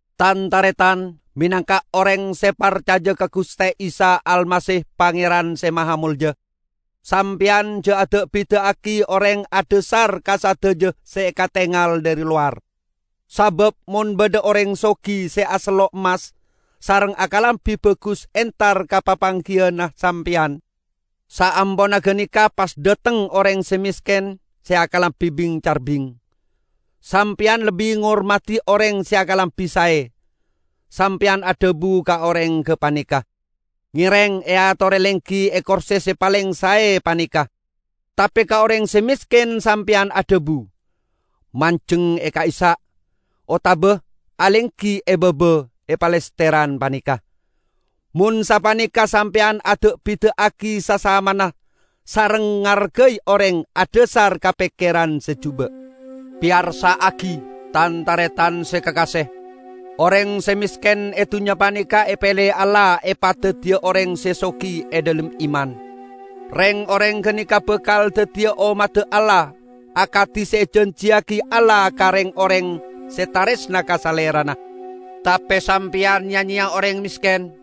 Tan-taretan! Menangka oreng se parcaja ka Guste Isa Almasih Pangeran Se Mahamolja, sampeyan ja' ada'-bida'agi oreng adhasar ka sadaja se katengal dhari lowar. Sabab mon badha oreng sogi se asello' emmas sareng akalambi bagus entar ka papanggiyanna sampeyan; saamponna ganeka pas dhateng oreng se mesken se akalambi bing-carbing, sampeyan lebbi ngormadi oreng se akalambi sae. Sampeyan adhabu ka oreng gapaneka, "Ngereng eatore lenggi e korse se paleng sae paneka," tape ka oreng se mesken sampeyan adhabu, "Manjeng e ka'issa'," otaba "alenggi e baba, e palesteran paneka." Mon sapaneka sampeyan ada'-bida'agi sasamana sareng ngargai oreng adhasar ka pekkeran se juba'. Peyarsa'agi, tan-taretan se kakase! Oreng se mesken e dunnya paneka epele Allah epadaddiya oreng se sogi e dhalem iman. Reng-oreng ganeka bakal daddiya ommadda Allah akadi se ejanjiyagi Allah ka reng-oreng se taresna ka Salerana. Tape sampeyan ya-nyeya oreng mesken!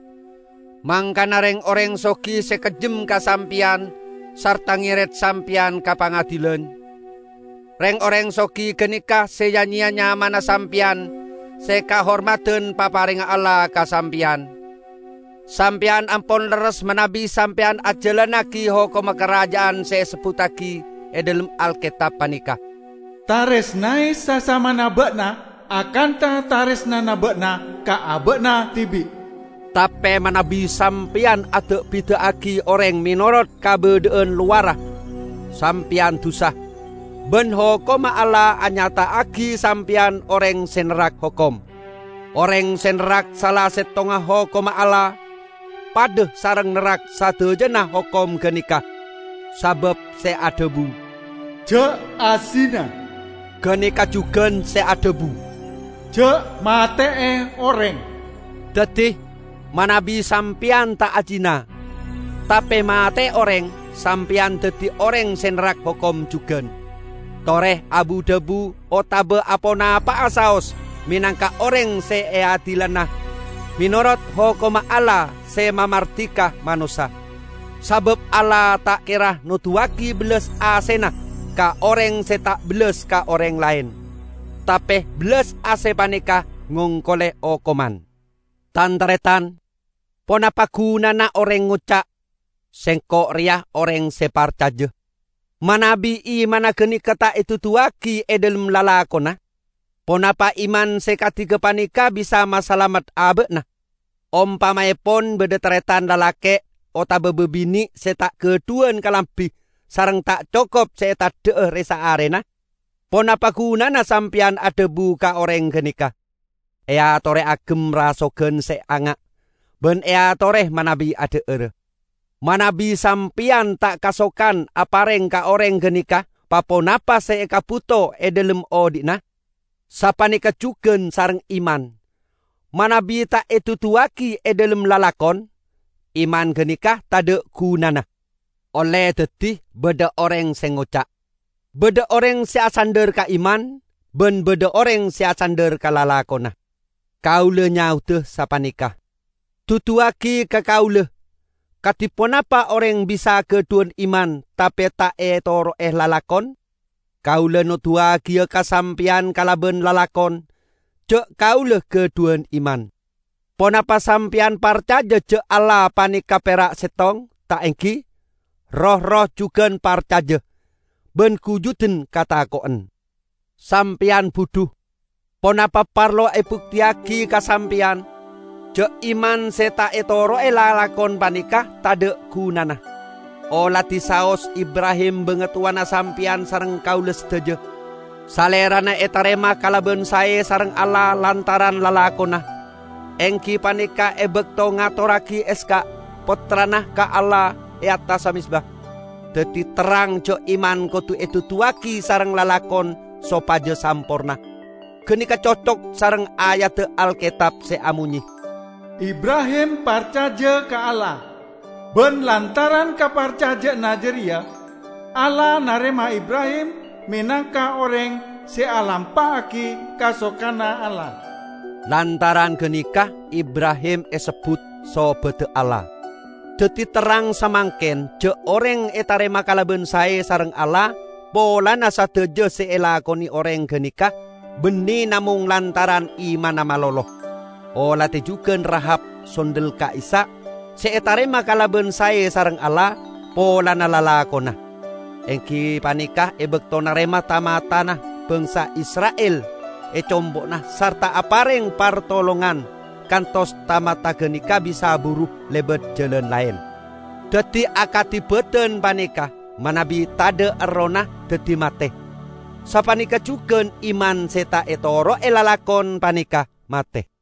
Mangkana reng-oreng sogi se kejjem ka sampeyan sarta ngeret sampeyan ka pangadilan! Reng-oreng sogi ganeka se ya-nyeya nyamana sampeyan se kahormadan paparengnga Allah ka sampeyan! Sampeyan ampon lerres, manabi sampeyan ajalannagi hokomma Karaja'an se esebbuttagi e dhalem Alketab paneka, "Taresnae sasamana ba'na akantha taresnana ba'na ka aba'na dibi'." Tape manabi sampeyan ada'-bida'agi oreng menorot kabadha'an lowarra, sampeyan dusa, ban hokomma Allah anyata'agi sampeyan oreng se nerrak hokom. Oreng se nerrak sala settongnga hokomma Allah, padha sareng nerrak sadajana hokom ganeka. Sabab se adhabu, "Ja' azina," ganeka jugan se adhabu, "Ja' mate'e oreng." Daddi, manabi sampeyan ta' ajina, tape mate'e oreng, sampeyan daddi oreng se nerrak hokom jugan. Tore abu-dhabu otaba aponapa'a saos menangka oreng se eadilana menorot hokomma Allah se mamardika manossa. Sabab Allah ta' kera noduwagi bellas asena ka oreng se ta' bellas ka oreng laen. Tape bellas ase paneka ngongkole okoman! Tan-taretan! Ponapa gunana oreng ngoca' "Sengko' reya oreng se parcaja", manabi imanna ganeka ta' eduduwagi e dhalem lalakonna? Ponapa iman se kadi gapaneka bisa masalamet aba'na? Ompamaepon badha taretan lalake' otaba babine' se ta' gadhuwan kalambi sareng ta' cokop se eteddha'a re-saarena. Ponapa gunana sampeyan adhabu ka oreng ganeka, "Eatore agem rasogan se anga' ban eatore manabi adha'ara!" -- manabi sampeyan ta' kasokan apareng ka oreng ganeka pa-ponapa se ekabuto e dhalem odhi'na? Sapaneka jugan sareng iman, manabi ta' eduduwagi e dhalem lalakon, iman ganeka tadha' gunana. Olle daddi badha oreng se ngoca', "Badha oreng se asandhar ka iman ban badha oreng se asandhar ka lalakonna." Kaula nyaoda sapaneka, "Duduwagi ka kaula kadi ponapa oreng bisa gadhuwan iman tape ta' etoro'e lalakon. Kaula noduwagiya ka sampeyan kalaban lalakon ja' kaula gadhuwan iman." Ponapa sampeyan parcaja ja' Allah paneka pera' settong, ta' enggi? Roh-erroh jugan parcaja, ban gujuden katako'en! Sampeyan budhu! Ponapa parlo ebukteyagi ka sampeyan ja' iman se ta' etoro'e lalakon paneka tadha' gunana? Oladi saos Ibrahim bangatowana sampeyan sareng kaula sadaja. Salerana etarema kalaban sae sareng Allah lantaran lalakonna, enggi paneka e bakto ngatorragi Ishak, pottrana, ka Allah, e attassa mezba. Daddi terrang ja' iman kodu eduduwagi sareng lalakon sopaja samporna. Ganeka cocok sareng ayadda Alketab se amonye, "Ibrahim parcaja ka Allah, ban lantaran kaparcaja'anna jareya, Allah narema Ibrahim menangka oreng se alampa'agi kasokanna Allah." Lantaran ganeka Ibrahim esebbut "Sobadda Allah". Daddi terrang samangken ja' oreng etarema kalaban sae sareng Allah polana sadaja se elakone oreng ganeka, banne namong lantaran imanna malolo. Oladi jugan Rahab, sondel ka'issa'. Se etarema kalaban sae sareng Allah polana lalakonna, enggi paneka e bakto narema ta-matana bangsa Isra'il e compo'na sarta apareng partolongan kantos ta-mata ganeka bisa buru lebat jalan laen. Daddi, akadi badan paneka manabi tadha' errohna daddi mate, sapaneka jugan iman se ta' etoro'e lalakon paneka mate.